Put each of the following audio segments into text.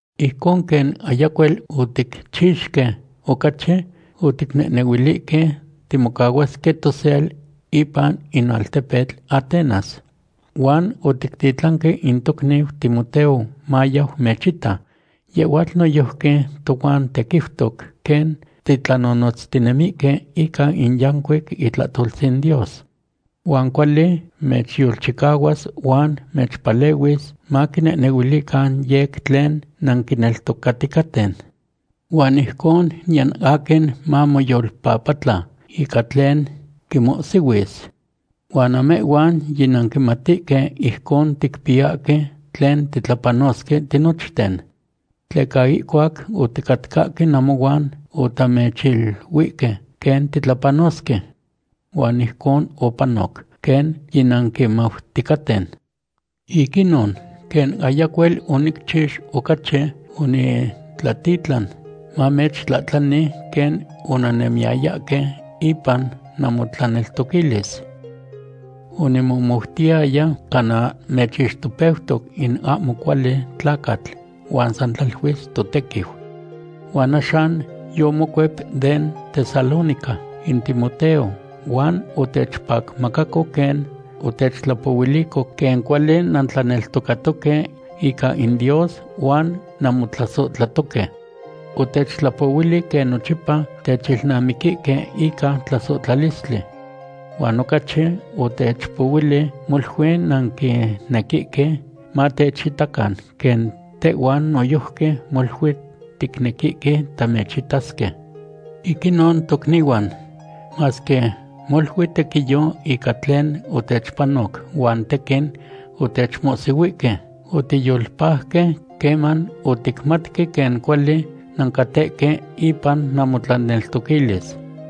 Ijcon quen ayacuel oticchixque ocachi, oticnehnehuilihque timocahuasque tosel ipan in altepetl Atenas. Huan otictitlanque in tocniu Timoteo mayau mechita. Yehhuatl noyojqui tohuan tequiutoc quen titlanonotztinemihque ica in yancuic itlahtoltzin Dios. Huan cuali mechyolchicahuas huan mechpalehuis maquinehnehuilican yec tlen nanquineltocaticaten. Huan ijcon niyan aquin ahmo mamoyolpapatla ican tlen quihmohsihuis. Huan namehhuan yinanquimatihque ijcon ticpiyahque tlen titlapanosque tinochten. Tleca ihcuac oticatcahque namohuan otamechiluihque quen titlapanosque. Huan ijcon opanoc, quen yinanquimauticaten. Ic inon, quen ayacuel onicchix ocachi, onitlatitlan mamechtlahtlani quen onannemiyayahque ipan namotlaneltoquilis. Onimomoutiyaya cana mechixtopeutoc in ahmo cuali tlacatl huan san tlaluis totequiu. Huan axan yomocuep den Tesalónica in Timoteo huan otechpacmacaco quen otechtlapohuilico quen cuali nantlaneltocatoque ica in Dios huan nanmotlasohtlatoque. Otechtlapohuili quen nochipa techilnamiquihque ica tlasohtlalistli. Huan ocachi otechtlapohuili molui nanquinequihque matechitacan quen tehhuan noyojqui molui ticnequihque tamechitasque. Ic inon tocnihuan, masque molui tequiyo ica tlen otechpanoc huan tequin otechmohsihuihque, otiyolpajque queman oticmatque quen cuali nancatehque ipan namotlaneltoquilis.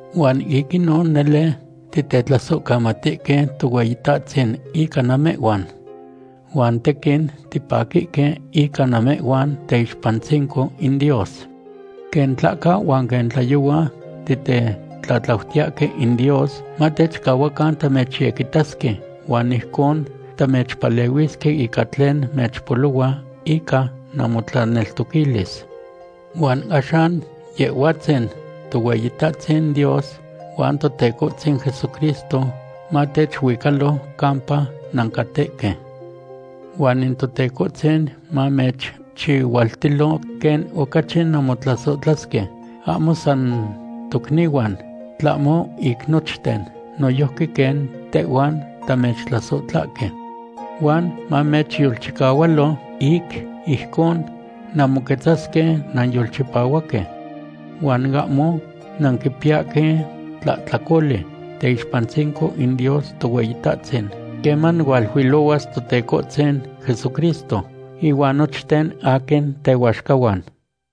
Huan ic inon nele titetlasohcamatisque Tohueyitahtzin ica namehhuan. Huan tequin tipaquihque ica namehhuan teyixpantzinco in Dios. Quen tlahca huan quen tlayohua titetlatlautiyahque in Dios matechcahuacan tamechyequitasque, huan ijcon tamechpalehuisque ica tlen mechpolohua ica namotlaneltoquilis. Huan axan Yehhuatzin Tohueyitahtzin Dios huan Totecohtzin Jesucristo matechuicalo campa nancatehque. Huan in Totecohtzin mamechchihualtilo quen ocachi nanmotlasohtlasque, ahmo san tocnihuan, tlahmo ic nochten, noyojqui quen tehhuan tamechtlasohtlahque. Huan mamechyolchicahualo ic ijcon nanmoquetzasque nanyolchipahuaque. Huan ahmo nanquipiyahque tlahtlacoli teyixpantzinco in Dios Tohueyitahtzin queman hualuilohuas Totecohtzin Jesucristo ihuan nochten aquin tehuaxcahuan.